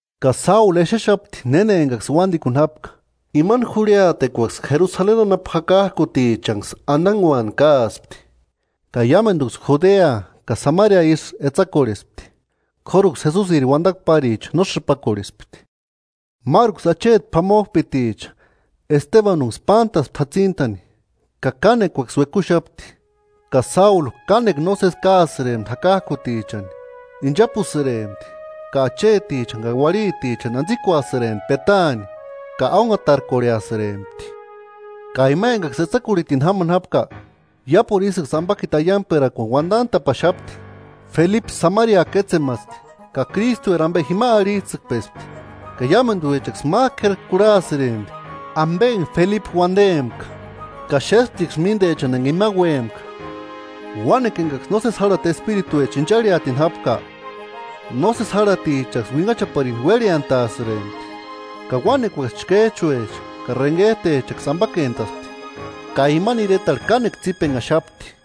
Ka Sáulu exexapti néna enkaksï uántikuni jápka. Sáulu jakak'utichani antaguani káasti Imani jurhiatekuaksï Jerusaleni anapu jakak'utichanksï antaguani káaspti, ka iámentuksï Judea ka Samaria ísï etsakorhespti, k'óruksï Jesusiri uantakua páricha no sïpakorhespti. Máruksï acheti p'amok'up'iticha Estebanunksï pántaspti jatsintani, ka kánekuaksï uekuxapti. Ka Sáulu kánekua nósesi káasïrempti jakak'utichani; inchapusïrempti ka achetichani ka uarhitichani antsikuasïrempti petaani ka ónhaatarkorheasïrempti. Ka ima enkaksï etsakurhitini jámani jápka iápuru ísïksï ampakiti aiankperakuani uantant'a'paxapti. Felipe Samaria kétsemaspti ka Krístueri ampe jima arhits'ïkpespti. Ka iámentuechaksï mák'u k'éri kurhasïrempti ampe enka Felipe uantempka, ka xésptiksï míntechani enka ima úempka, uánekua enkaksï nósesi jarhati espirituecha incharhiatini jápka, nósesi járhatichaksï uinhachaparini uérheantasïrempti, ka uánekuaksï chkéch'uecha ka renhet'echaksï ampakentaspti. Ka imani iretarhu kánekua tsípenhaxapti.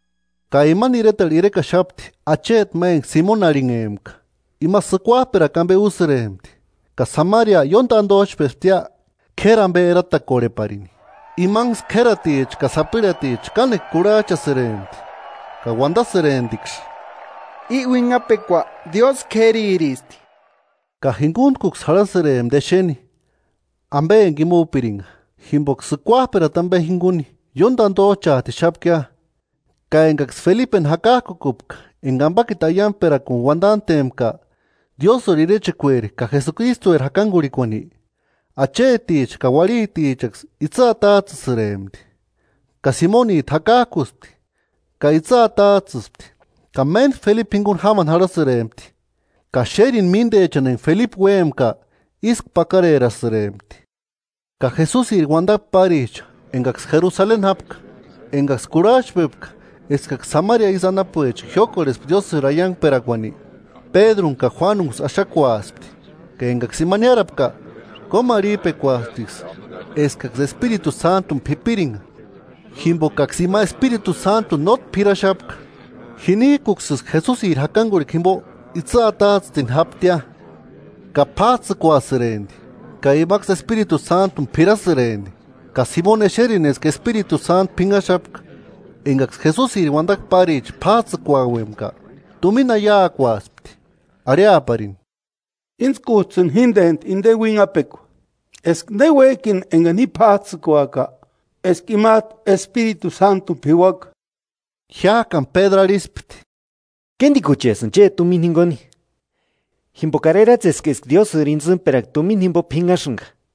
Ka imani iretarhu irekaxapti acheti ma enka Simoni arhinhempka, ima sïkuap'erakua ampe úsïrempti, ka Samaria ióni tantoch'pesptia k'éri ampe eratakorheparini. Imanksï k'ératicha ka sapirhaticha kánekua kurhach'asïrempti ka uantasïremptiksï: “I uinhapekua Diósï k'ériristi.” Ka jinkuntkuksï jarhasïrempti exeni ampe enka ima úpirinka, jimpoka sïkuap'erata ampe jinkuni ióni tántoch'aatixapkia. Ka enkaksï Felipeni jakak'ukupka enka ampakiti aiankperakuani uantantempka Diósïri irechekueri ka Jesukristueri jakankurhikuani, acheticha ka uarhitichaksï itsï atats'ïsïrempti. Ka Simonit'u jakak'uspti, ka itsï atats'ïspti ka méntku Felipe jinkuni jámani jarhasïrempti; ka xérini míntechani enka Felipe úempka ísku pakarerasïrempti. Ka Jesusiri uantakua páricha enkaksï Jerusaleni jápka, enkaksï kurhach'pepka eskaksï Samaria ísï anapuecha jiókorhespka Diósïri aiankperakuani, Pédruni ka Juánunksï axakuaspti. Ka enkaksï ima niárapka, kómarhip'ekuasptiksï eskaksï Espiritu Sántuni p'ipirinka. Jimpokaksï ima Espiritu Sántuni nótki p'iraxapka, jinik'uksïsï Jesusiri jakankurhikua jimpo itsï atats'ïtini jáptia. Ka p'áts'ïkuasïrempti ka imaksï Espiritu Sántuni p'irasïrempti. Ka Simoni exerini eska Espiritu Sántu p'inhaxapka enkaksï Jesusiri uantakua páricha p'áts'ïkuauempka, tumina aiakuaspti, arhiaparini: –Íntskuts'ïni jíntentu inteni uinhapekua, eska néuek'ini enkani ji p'áts'ïkuaka, eska imat'u Espiritu Sántuni p'iuaka. Jiák'ani Pédru arhispti: –¡Kéntikuchets'ïni chéti tumina jinkuni! Jimpokari eratseska eska Diósïri intsïmperakua tumina jimpo p'inhasïnka.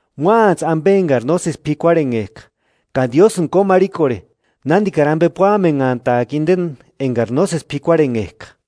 Móantsï ampe enkari nósesi p'ikuarhenhek'a, ka Diósïni kómarhikorhe, nántikari ampe púamenhant'aaka inteni enkari nósesi p'ikuarhenhek'a,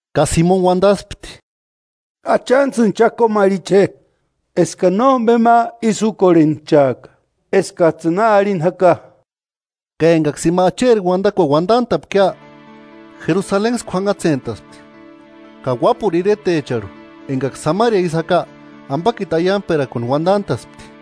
Ka Simoni uantaspti: –Achantsïni cha kómarhiche je, eskani nómpe ma ísï úkorhenchaaka eskats'ïni na arhini jaka. Ka enkaksï ima Acheri uantakuani uantant'a'pkia, Jerusalenksï kuanhatsentaspti, ka uápuru iretecharhu enkaksï Samaria ísï jaka ampakiti aiankperakuani uantant'a'spti.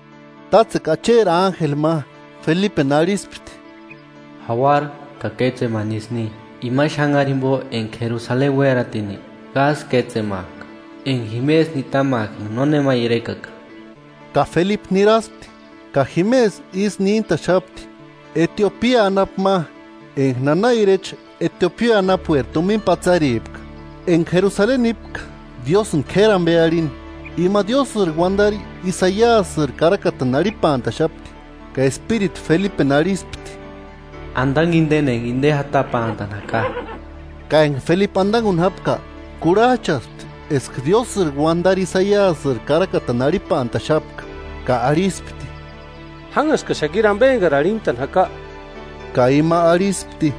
Tátsekua Acheri ánjeli ma Felipeni arhispti: “Jauara ka kétsemani isï ni, imani xanhari jimpo enka Jerusaleni uératini Gása kétsemak'a, enka jimesï nitamak'a enka nónema irekaka.” Ka Felipe niraspti. Ka jimesï isï níntaxapti Etiopia anapu ma, enka nana irecha Etiopia anapueri tumina patsaripka, enka Jerusaleni nípka Diósïni k'éri ampe arhini. Ima Diósïri uantari Isaiasïri karakatani arhipantaxapti. Ka Espiritu Felipeni arhispti: “Antanku inteni enka inte jatapantani jaka.” Ka enka Felipe antankuni jápka, kurhach'aspti eska Diósïri uantari Isaiasïri karakatani arhipantaxapka ka arhispti: –¿Jánhaskaxakiri ampe enkari arhintani jaka? Ka ima arhispti: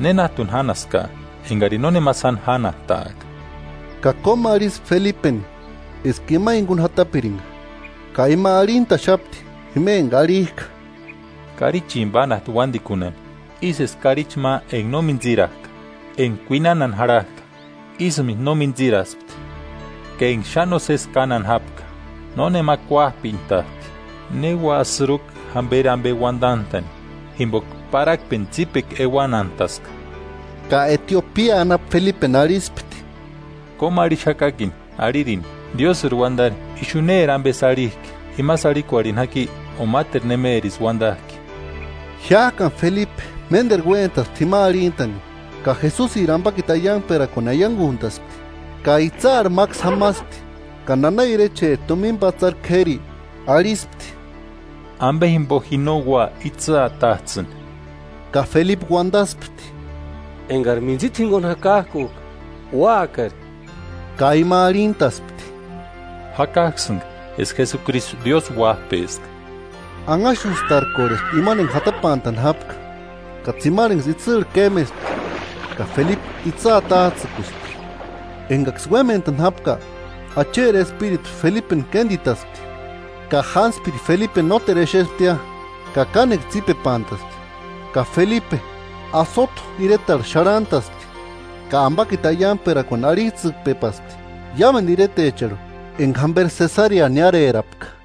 –¿Nénat'uni jánhaskaa, enkarini nónema sáni jánhastak'a? Ka kómarhispti Felipeni eska ima jinkuni jatapirinka. Ka ima arhintaxapti jima enka arhik'a: “Karichini pánhasti uántikunhani, ísï eska karichi ma enka no mintsirak'a enka kuinanhani janhak'a, ísïmentu no mintsiraspti. Ka enka xáni nósesi kánhani jápka, nónema kuáp'entaspti: ¿Ne ua sïrukua jémperi ampe uantant'a'ni? Jimpoka parhakpeni tsípekua euanhantaska.” Ka Etiopia anapu Felipeni arhispti: –Kómuarhixakakini, arhirini: ¿Diósïri uantari ixu néri ampesï arhik'i; imasï arhikorheni jaki o máteru nemerisï uantak'i? Jiák'ani Felipe ménteru uéntaspti jima arhintani, ka Jesusiri ampakiti aiankperakuani aiankunt'aspti. Ka itsïarhu máksï jamaspti, ka nana irecheri tumina patsari k'éri, arhispti: –Ixu itsï jatasti, ¿Ampe jimpo ji no ua itsï atats'ïni? [Ka Felipe uantaspti: –Enkari mintsita jinkuni jakak'uk'a, úakari. Ka ima arhintaspti: –Jakak'usïnka eska Jesukristu Diósï Uáp'eska.] Anhaxustarkorhespti imani enka jatapantani jápka, ka tsimarhenksï itsïrhu kémespti ka Felipe itsï atats'ïkuspti. Enkaksï uémentani jápka Acheri Espiritu Felipeni kéntitaspti, ka jántspiri Felipeni nóretu exesptia ka kánekua tsípepantaspti. Ka Felipe Asoto iretarhu xarhantaspti, ka ampakiti aiankperakuani arhits'ïkpepaspti iámentu iretecharhu enka jamperi Sesarea niárerapka.